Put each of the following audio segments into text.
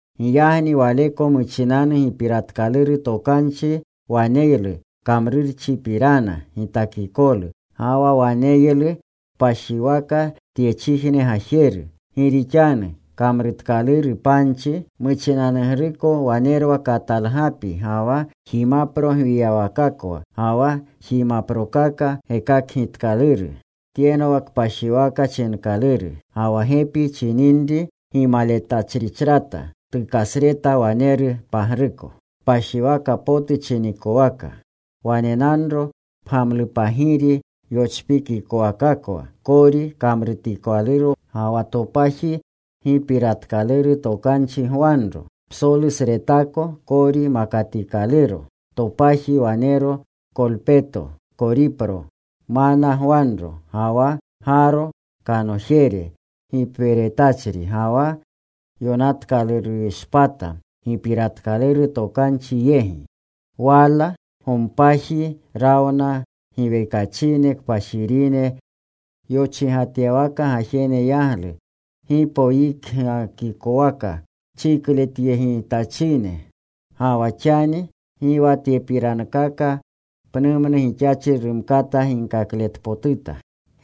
Giyagni waleko muchinanu Gipiratkaluru Tokanchi waneylu kamrurchipirana gitakikolu. Ga wa waneylu kpashiwaka tyechijne gajeru. Gi rixanu kamrutkaluru panchi. Muchinanugruko wanerwa katalgapi ga wa jimapro gwiyawakakwa, ga wa jimaprokaka gekakgitkaluru. Tyenwa Kpashiwaka chinkaluru. Ga wa gepi chininri gimaletachrichrata tukasreta waneru pagruko, Kpashiwaka potu chinikowaka. Wanenanro pgamlupagiri yochpikikowakakwa kori kamrutikalurokwa, ga wa topaji gipiratkaluru tokanchi gwanro, psolusretako kori makatikaluro. Topaji wanero kolpeto koripro mana gwanro, ga wa Gaaro kanojere gipweretachri, ga wa yonatkalurushpata gipiratkaluru tokanchi yegi. Wala gompaji rawna giwekachine kpashirine yochigatyawaka gajene yaglu, gipoyikgikowaka chikletyegitachine. Ga wa xani gi wa tyepirankaka pnumnu gixachri rumkata ginkakletpotuta.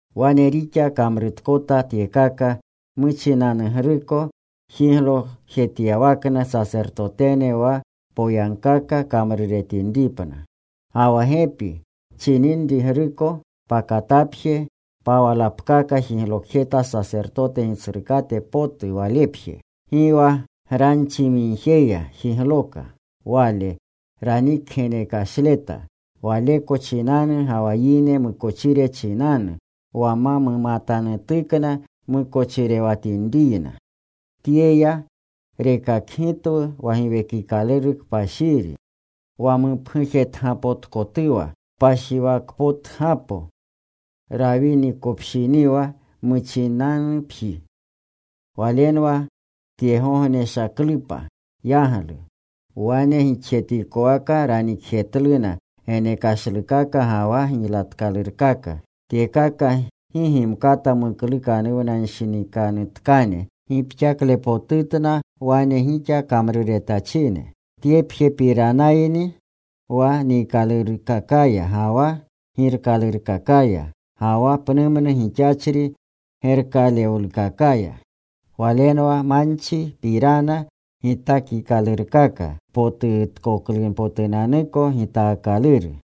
Wane rixa kamrutkota tyekaka, muchinanugruko jiglokjetyawakna sasertotene wa poyagkaka kamruretinripna. Ga wa gepi chininrigruko pakatapje pawalapkaka jiglokjeta sasertote gitsrukate potu walepje. Gi wa granchimigjeya jigloka. Wale ranikgenekashleta waleko chinanu ga wa yine mukochire chinanu wa ma mumatanutukna mukochirewatinriyna. Tyeya rekakgitwu wa Giwekikaluru Kpashiri, wa mupgujetgapotkotuwa kpashiwakpotgapo, rawinikopshiniwa muchinanupji. Walenwa tyegogneshaklupa yaglu. Wane gixjetikowaka ranikjetluna genekashlukaka ga wa giylatkalurkaka. Tyekaka gi gimkata muklukanuwnanshinikanutkane gixkaklepotutna wane gixa kamruretachine. Tyepjepiranayni wa niikalurkakaya, ga wa girkalurkakaya, ga wa pnumnu gixachri gerkalewlukakaya. Walenwa manchipirana gitakikalurkaka, potukatpotutkoklunpotunanuko gitaakaluru.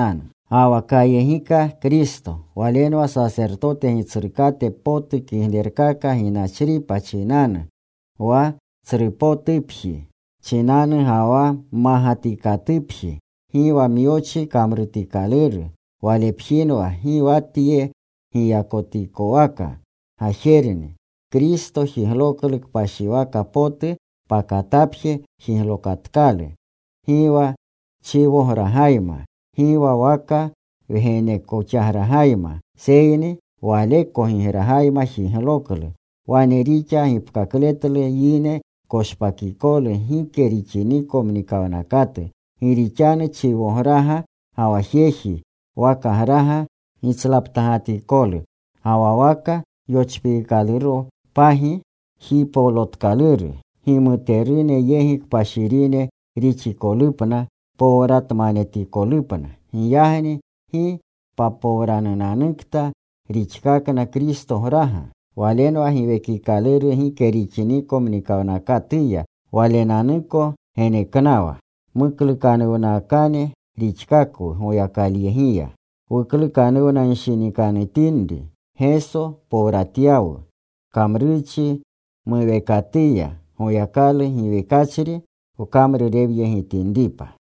Ga wa kayegika Kristo. Walenwa sasertote Gitsrukate potu kiglerkaka ginachripa chinanu, wa tsrupotupji chinanu ga wa mmagatikatupji, gi wa myochi kamrutikaluru. Walepjinwa gi wa tye giyakotikowaka gajerni. Kristo jigloklu kpashiwaka potu. Pakatapje jiglokatkalu. Gi wa chiwogragayma, gi wa waka wgenekogragayma, seyni Waleko gigragayma jigloklu. Wane rixa gapkapletlu yine koshpakikolu gike rixiniko mnikawnakatu. Gi rixanu chiwograga, ga wa jeji wakagraga gitslaptagatikolu, ga wa waka yochpiikaluropagi jipolotkaluru gimuterune yegi kpashirine rixikolupna powratmanetikolupna. Giyagni ¡gi papowrananukta rixkakna Kristograga! Walenwa Giwekikaluru gike rixiniko mnikawnakatuya Walenanuko geneknawa. Muklukanuwnakane rixkakwu Goyakalyegiya. Wuklukanuwnanshinikanutinri, Geso powratyawu kamrurchi muweekatuya, Goyakalu giwekachri wkamrurewyegitinripa.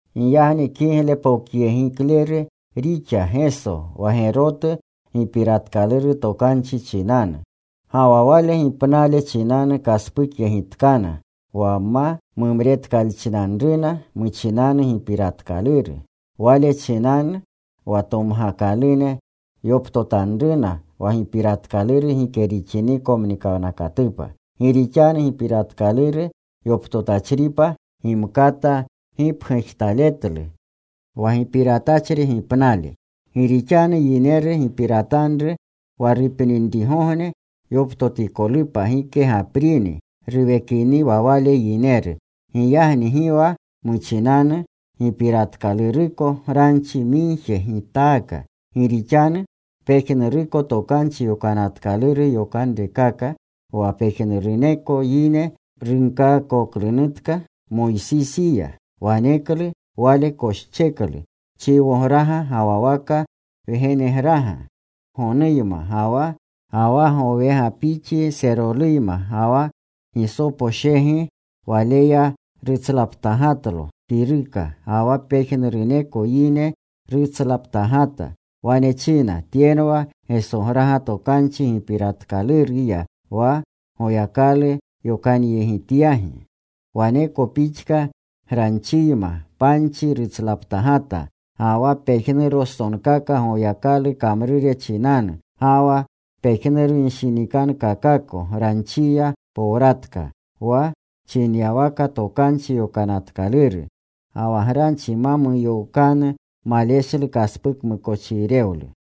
Giyagni kiglepokyegikleru rixa Geso wa gerotu Gipiratkaluru Tokanchi chinanu. Ga wa Wale gipnale chinanu kaspukyegitatkana wa ma mumretkalchinanruna muchinanu gipiratkaluru. Wale chinanu wa tomgakalune yoptotanruna wa gipiratkaluru gike rixiniko mnikawnakatupa. Gi rixanu gipiratkaluru yoptotachripa gimkata gipgujtaletlu wa gipiratachri gipnale. Gi rixanu yineru giparatanru wa rupninrigogne yoptotikolupa gike gaprini ruwekiniwa wale yineru. Giyagni gi wa muchinanu gipiratkaluruko granchi migje gitaaka. Gi rixanu pejnuruko Tokanchi Yokanatkaluru yokanrekaka, wa pejnuruneko yine runkaakoklunutka Moysisiya, waneklu wale koscheklu chiwograga ga wa waka wgenegraga, gonuyma ga wa gowegapixi seroluyma, ga wa gisoposhegi. Waleya rutslaptagatlo kiruka, ga wa pejnuruneko yine rutslaptagata. Wane china: Tyenwa Gesograga Tokanchi gipiratkaluruya, wa Goyakalu yokanyegityagi. Waneko pixka granchiyma panchi rutslaptagata, ga wa pejnurostonkaka Goyakalu kamrure chinanu. Ga wa pejnurunshinikankakako, granchiya powratka, wa chinyawaka Tokanchi Yokanatkaluru. Ga wa granchi ma muyookanu, maleshlu kaspukmukochirewlu.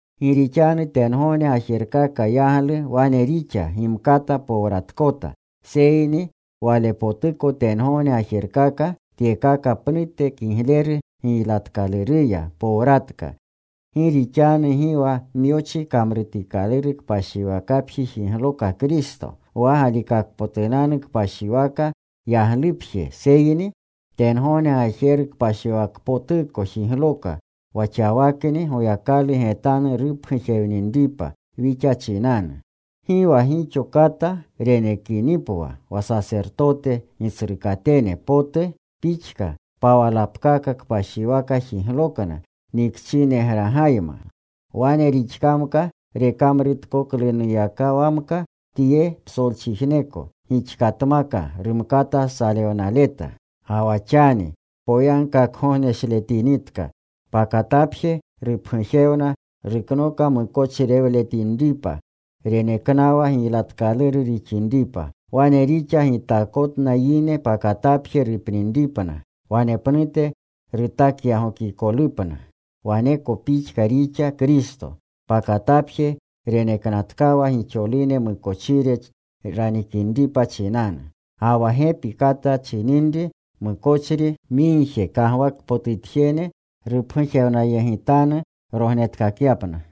Gi rixanu tengogne gajerkaka yaglu wane rixa gimkata powratkota, seyni walepotuko tengogne gajerkaka, tyekaka pnute kigleru giylatkaluruya powratka. Gi rixanu gi wa myochi kamrutikaluru kpashiwaka jigloka Kristo, wa galikakpotunanu kpashiwaka yaglupje, seyni tengogne gajeru kpashiwakpotuko jigloka, wa xawakni Goyakalu getanu rupgujewninripa wixa chinanu. Gi wa gixo kata renekinipwa wa sasertote gitsrukatene potu pixka, pawalapkaka kpashiwaka jiglokna nikchinegragayma. Wane rixkamka rekamruretkoklunuyakawamka tye psolchijneko, gixkatmaka rumkata salewnaleta. Ga wa xani poyagkakgogneshletinitka, pakatapje rupgujewna ruknoka mukochirewlewatinripa, reneknawa giylatkaluru rixinripa. Wane rixa gitakikotna yine pakatapje rupninripna, wanepnute rutakyagokikolupna. Waneko pixka rixa Kristo. Pakatapje reneknatkawa gixolune mukochire ranikinripa chinanu. Ga wa gepi kata chininri mukochri migje, kagwakpotutjene rupgujewnayegitanu rognetkakyapna.